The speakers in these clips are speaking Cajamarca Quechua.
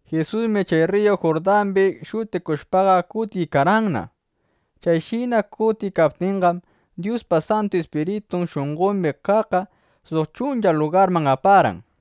Jisusmi chay rriyu Jurdambi shutikushpaqa, kutiykarqanna. Chayshina kutiykaptinqam, Dyuspa Santu Ispiritun shunqombi kaqqa suq chuncha lugarman aparqan.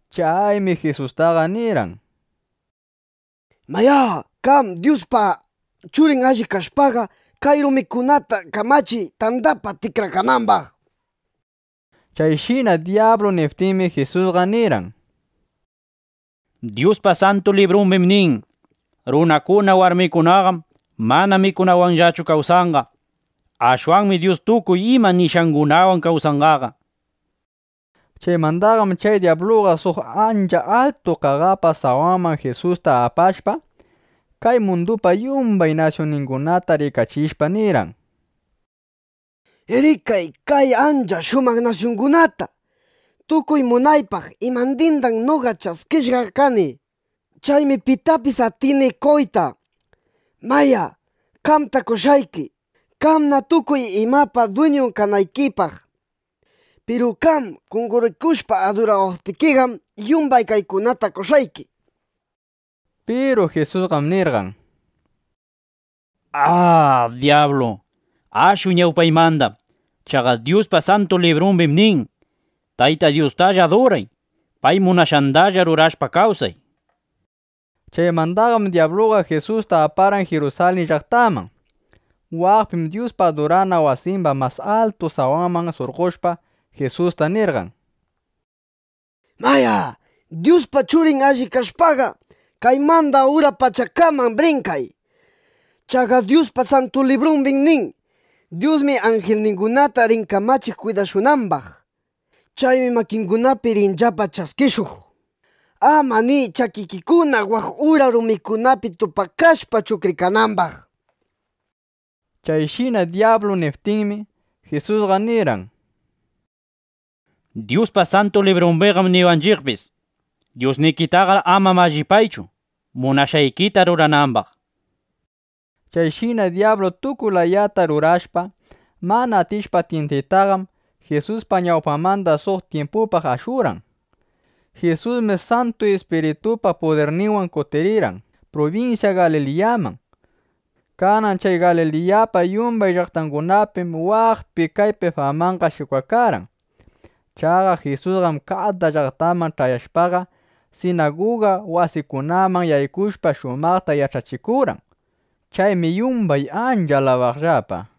Chaymi Jisustaqa nirqan: —Mayá, qam Dyuspa Churin allip kashpaqa, kay rumita kamachiy, tandapaq tikrakanambaq, nishpa. Chayshina dyablu niptinmi, Jisusqa nirqan: —Dyuspa Santu Librumbim nin: “Runakuna, warmikunaqam mana mikunawanllachu kawsanqa. Ashwanmi Dyus tukuy ima nishqangunawan kawsanqa”, nishpa. Chaymandaqam chay dyabluqa suq ancha altu qaqapa sawanman Jisusta apashpa, kay mundupa yumban nasyunningunata rikachishpa, nirqan: —Rikay kay ancha shumaq nasyungunata. Tukuy munaypaq imandindam noqa ch'askishqa kani. Chaymi pitapis atini qoyta. Mayá, qamta qoshqayki, qamna tukuy imapa dwiñun kanaykipaq. Piru qam qonqorikushpa adurawaptikiqam, yumbay kaykunata qoshqayki, nishpa. Piru Jisusqam nirqan: —¡A, dyablu, ashuy ñawpaymanda! Chaqa Dyuspa Santu Librumbim nin: “Tayta Dyustalla aduray. Pay munashqandalla rurashpa kawsay”, nishpa. Chaymandaqam dyabluqa Jisusta aparqan Jirusalin llaqtaman. Waqpim Dyuspa adurana wasimba mas altu sawanman surqoshpa, Jisusta nirqan: —Mayá, Dyuspa Churin allip kashpaqa, kaymanda ura pachakaman brinkay. Chaqa Dyuspa Santu Librumbim nin: “Dyusmi anjilningunata rin kamachiq kwidashunambaq. Chaymi makingunapi rinllapa ch'askishuq, ama ni ch'akikikuna waq ura rumikunapi tupakashpa chuqrikanambaq”, nishpa. Chayshina dyablu niptinmi, Jisusqa nirqan: —Dyuspa Santu Librumbiqam niwanchiqpis: “Dyusnikitaqar ama mallipaychu, munashqaykita ruranambaq”, nishpa. Chayshina dyablu tukuy layata rurashpa, mana atishpa tyintaytaqam, Jisuspa ñawpanmanda suq tyimpupaq ashurqan. Jisusmi Santu Ispiritupa pudirninwan kutirqan prubinsya Galiliyaman. Kanan chay Galiliyapa yumbay llaqtangunapim waqpi kaypi famanqa shikwakarqan. Chaqa Jisusqam kada llaqtaman ch'ayashpaqa, sinaguga wasikunaman yaykushpa, shumaqta yach'achikurqan. Chaymi yumbay ancha alabaqllapa.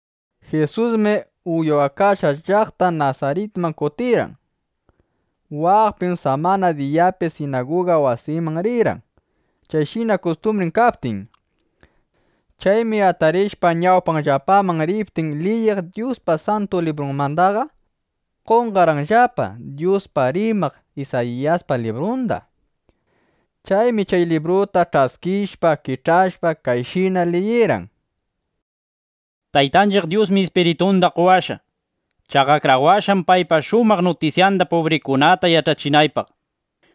Jisusmi uywakashqan llaqta Nasaritman kutirqan. Waqpim samana diyapi sinaguga wasiman rirqan, chayshina kustumbrin kaptin. Chaymi atarishpa, ñawpanllapaman riptin liyiq Dyuspa Santu Librunmandaqa, qorqanllapa Dyuspaq rimaq Isayiyaspa librunda. Chaymi chay libruta ch'askishpa, kich'ashpa, kayshina liyirqan: Taytanchiq Dyusmi Ispiritunda qowashqa. Chaqa akrawashqam, paypa shumaq nutisyanda pubrikunata yach'achinaypaq.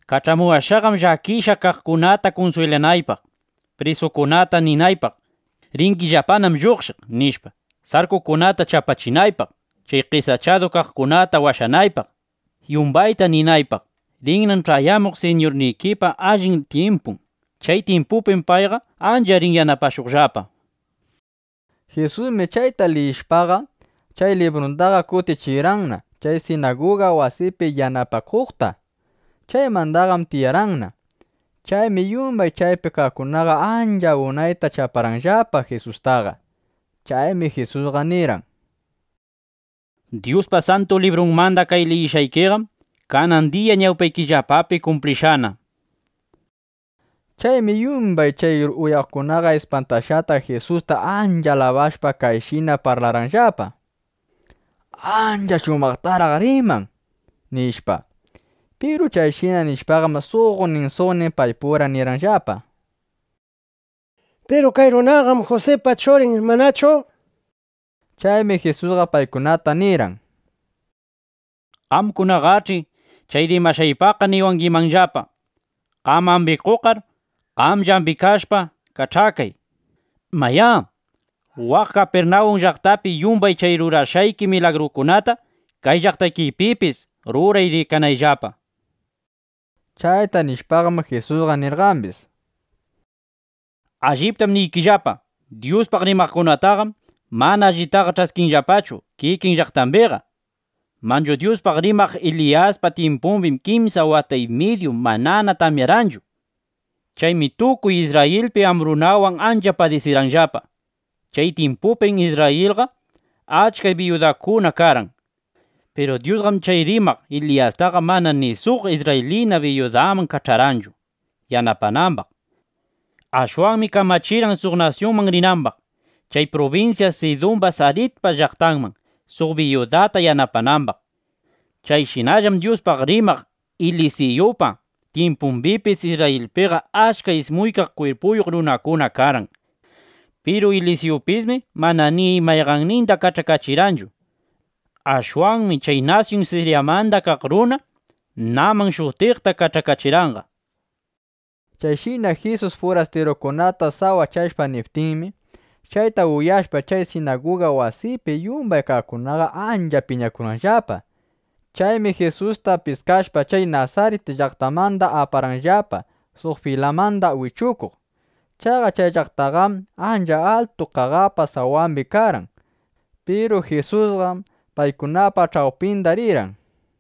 ˻Kach'amuwashqam llakishqa kaqkunata kunswilanaypaq˼ prisukunata ninaypaq: “Ringillapanam lluqshiq”, nishpa, sarkukunata chapachinaypaq; chay qesachadu kaqkunata washanaypaq; yumbayta ninaypaq: “Rinnam ch'ayamuq Siñurnikipa allin tyimpun. Chay tyimpupim payqa ancha rin yanapashuqllapa”, nishpa. Jisusmi chayta liyishpaqa, chay librundaqa kutichirqanna chay sinaguga wasipi yanapakuqta. Chaymandaqam tiyarqanna. Chaymi yumbay chaypi kaqkunaqa ancha unayta chaparqanllapa Jisustaqa. Chaymi Jisusqa nirqan: —Dyuspa Santu Librunmanda kay liyishqayqam kanan diya ñawpaykillapapi kumplishqana, nishpa. Chaymi yumbay chay uyaqkunaqa ispantashqata, Jisusta ancha alabashpa, kayshina parlaqllapa: —¡Ancha shumaqtaraq riman! nishpa. Piru chayshina nishpaqam, suqnin suqnin paypura nirqanllapa: —Piru kay runaqam Jusipa churin, ¿manachu? nishpa. Chaymi Jisusqa paykunata nirqan: —Qamkunaqach'i chay rimashqaypaqqa niwangimanllapa: “Qam ambikuqqar, qamlla ambikashpa, kach'akay. Mayá, waq Kapirnawun llaqtapi yumbay chay rurashqayki milagrukunata, kay llaqtaykipipis ruray rikanaypaqllapa”, nishpa. Chayta nishpaqam, Jisusqa nirqambis: —Alliptam niykillapa, Dyuspaq rimaqkunataqam mana allitaqa ch'askinllapachu kikin llaqtambiqa. Manchu Dyuspaq rimaq Eliyaspa tyimpumbim kimsa wata y midyuta mana tamyarqanchu. Chaymi tukuy Isrrayilpi ambrunawan ancha padisirqanllapa. Chay tyimpupim Isrrayilpiqa achka biyudakuna karqan. Piru Dyusqam chay rimaq Eliyastaqa mana ni suq isrraylina biyudaman kach'arqanchu yanapanambaq. Ashwanmi kamachirqan suq nasyunman rinambaq, chay prubinsya Sidumba Saripta llaqtanman, suq biyudata yanapanambaq. Chayshinallam Dyuspaq rimaq Elisiyupa tyimpumbipis Isrrayilpiqa achka ismuykaq kwirpuyuq runakuna karqan. Piru Elisiyupismi mana ni mayqanninda kach'akachirqanchu. Ashwanmi chay nasyun Siryamanda kaq runa Naman shutiqta kach'akachirqanqa. Chayshina Jisus furastirukunata sawachashpa niptinmi, chayta uyashpa, chay sinaguga wasipi yumbay kaqkunaqa ancha piñakurqanllapa. Chaymi Jisusta piskashpa, chay Nasarit llaqtamanda aparqanllapa, suq filamanda wichukuq. Chaqa chay llaqtaqam ancha altu qaqapa sawambi karqan. Piru Jisusqam paykunapa ch'awpinda rirqan.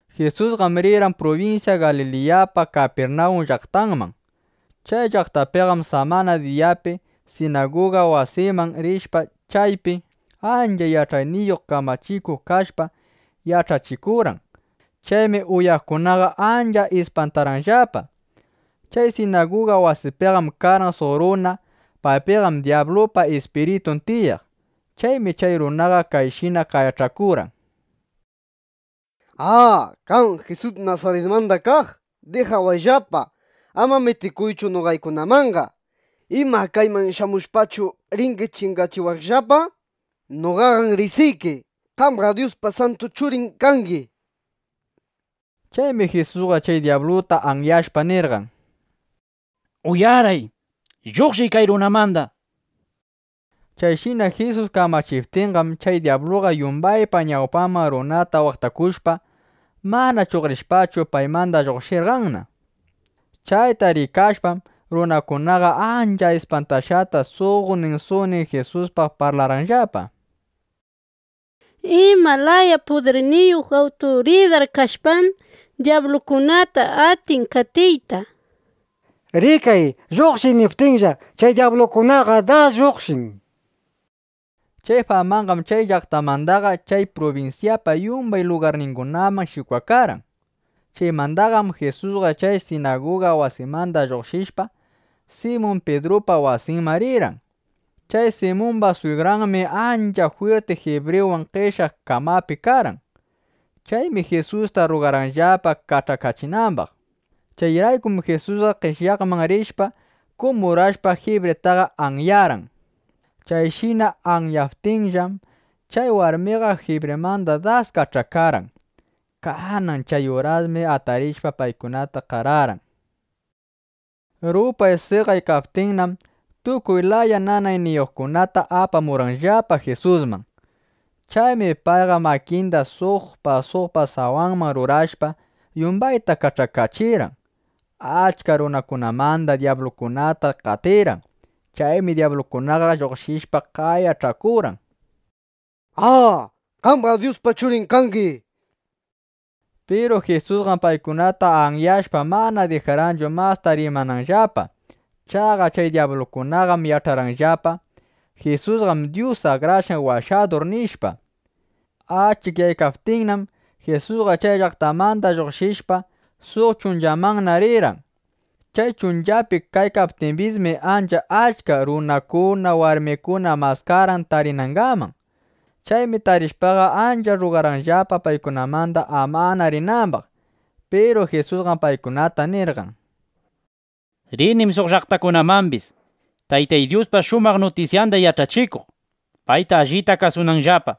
Jisusqam rirqan prubinsya Galiliyapa Kapirnawun llaqtanman. Chay llaqtapiqam samana diyapi sinaguga wasiman rishpa, chaypi ancha yach'ayniyuq kamachikuq kashpa, yach'achikurqan. Chaymi uyaqkunaqa ancha ispantarqanllapa. Chay sinaguga wasipiqam karqan suq runa. Paypiqam dyablupa ispiritun tiyaq. Chaymi chay runaqa kayshina qayach'akurqan: —¡A, qam, Jisus Nasaritmanda kaq! ¡Dijawayllapa! ¡Ama mitikuychu noqaykunamanqa! ¿Ima, kayman shamushpachu, ringi chingachiwaqllapa? ¡Noqaqam riqsiyki! ¡Qamqam Dyuspa santu Churin kangi! nishpa. Chaymi Jisusqa chay dyabluta anyashpa, nirqan. —¡Uyaray! ¡Lluqshiy kay runamanda! nishpa. Chayshina Jisus kamachiptinqam, chay dyabluqa yumbaypa ñawpanman runata waqtakushpa, mana chuqrishpachu, paymanda lluqshirqanna. Chayta rikashpam, runakunaqa ancha ispantashqata suqnin suqnin Jisuspaq parlarqanllapa: —¿Ima laya pudirniyuq awturidar kashpam, dyablukunata atin qatiyta? ¡Rikay, “Lluqshiy” niptinlla, chay dyablukunaqa das lluqshin! nishpa. Chay famanqam chay llaqtamandaqa chay prubinsyapa yumbay lugarningunaman shikwakarqan. Chaymandaqam Jisusqa chay sinaguga wasimanda lluqshishpa, Simun Pidrupa wasinman rirqan. Chay Simumba swigranmi ancha jwirti jibriwan qeshyaq kamapi karqan. Chaymi Jisusta rrugarqanllapa kach'akachinambaq. Chayraykum Jisusqa qeshyaqman rishpa, kumurashpa, jibritaqa anyarqan. Chayshina anyaptinllam, chay warmiqa jibrimanda das kach'akarqan. Kanan chay urasmi atarishpa, paykunata qararqan. Rupay seqaykaptinnam, tukuy laya nanayniyuqkunata apamurqanllapa Jisusman. Chaymi payqa makinda suqpa suqpa sawanman rurashpa, yumbayta kach'akachirqan. Achka runakunamandam dyablukunata qatirqan. Chaymi dyablukunaqa lluqshishpa, qayach'akurqan: —¡A, qamqam Dyuspa Churin kangi! nishpa. Piru Jisusqam paykunata anyashpa, mana dijarqanchu masta rimananllapa. Chaqa chay dyablukunaqam yach'arqanllapa: Jisusqam Dyus Akrashqan Washadur, nishpa. Achikyaykaptinnam, Jisusqa chay llaqtamanda lluqshishpa, suq chunchamanna rirqan. Chay chunchapi kaykaptimbismi, ancha achka runakuna, warmikuna maskarqan tarinangaman. Chaymi tarishpaqa, ancha rrugarqanllapa, paykunamanda amana rinambaq. Piru Jisusqam paykunata nirqan: —Rinim suq llaqtakunamambis, Taytay Dyuspa shumaq nutisyanda yach'achikuq, payta allita kasunanllapa.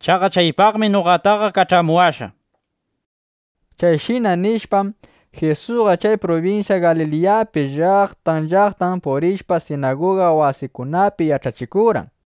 Chaqa chaypaqmi noqataqa kach'amuwashqa, nishpa. Chayshina nishpam, Jisusqa chay prubinsya Galiliyapi llaqtan llaqtan purishpa, sinaguga wasikunapi yach'achikurqan.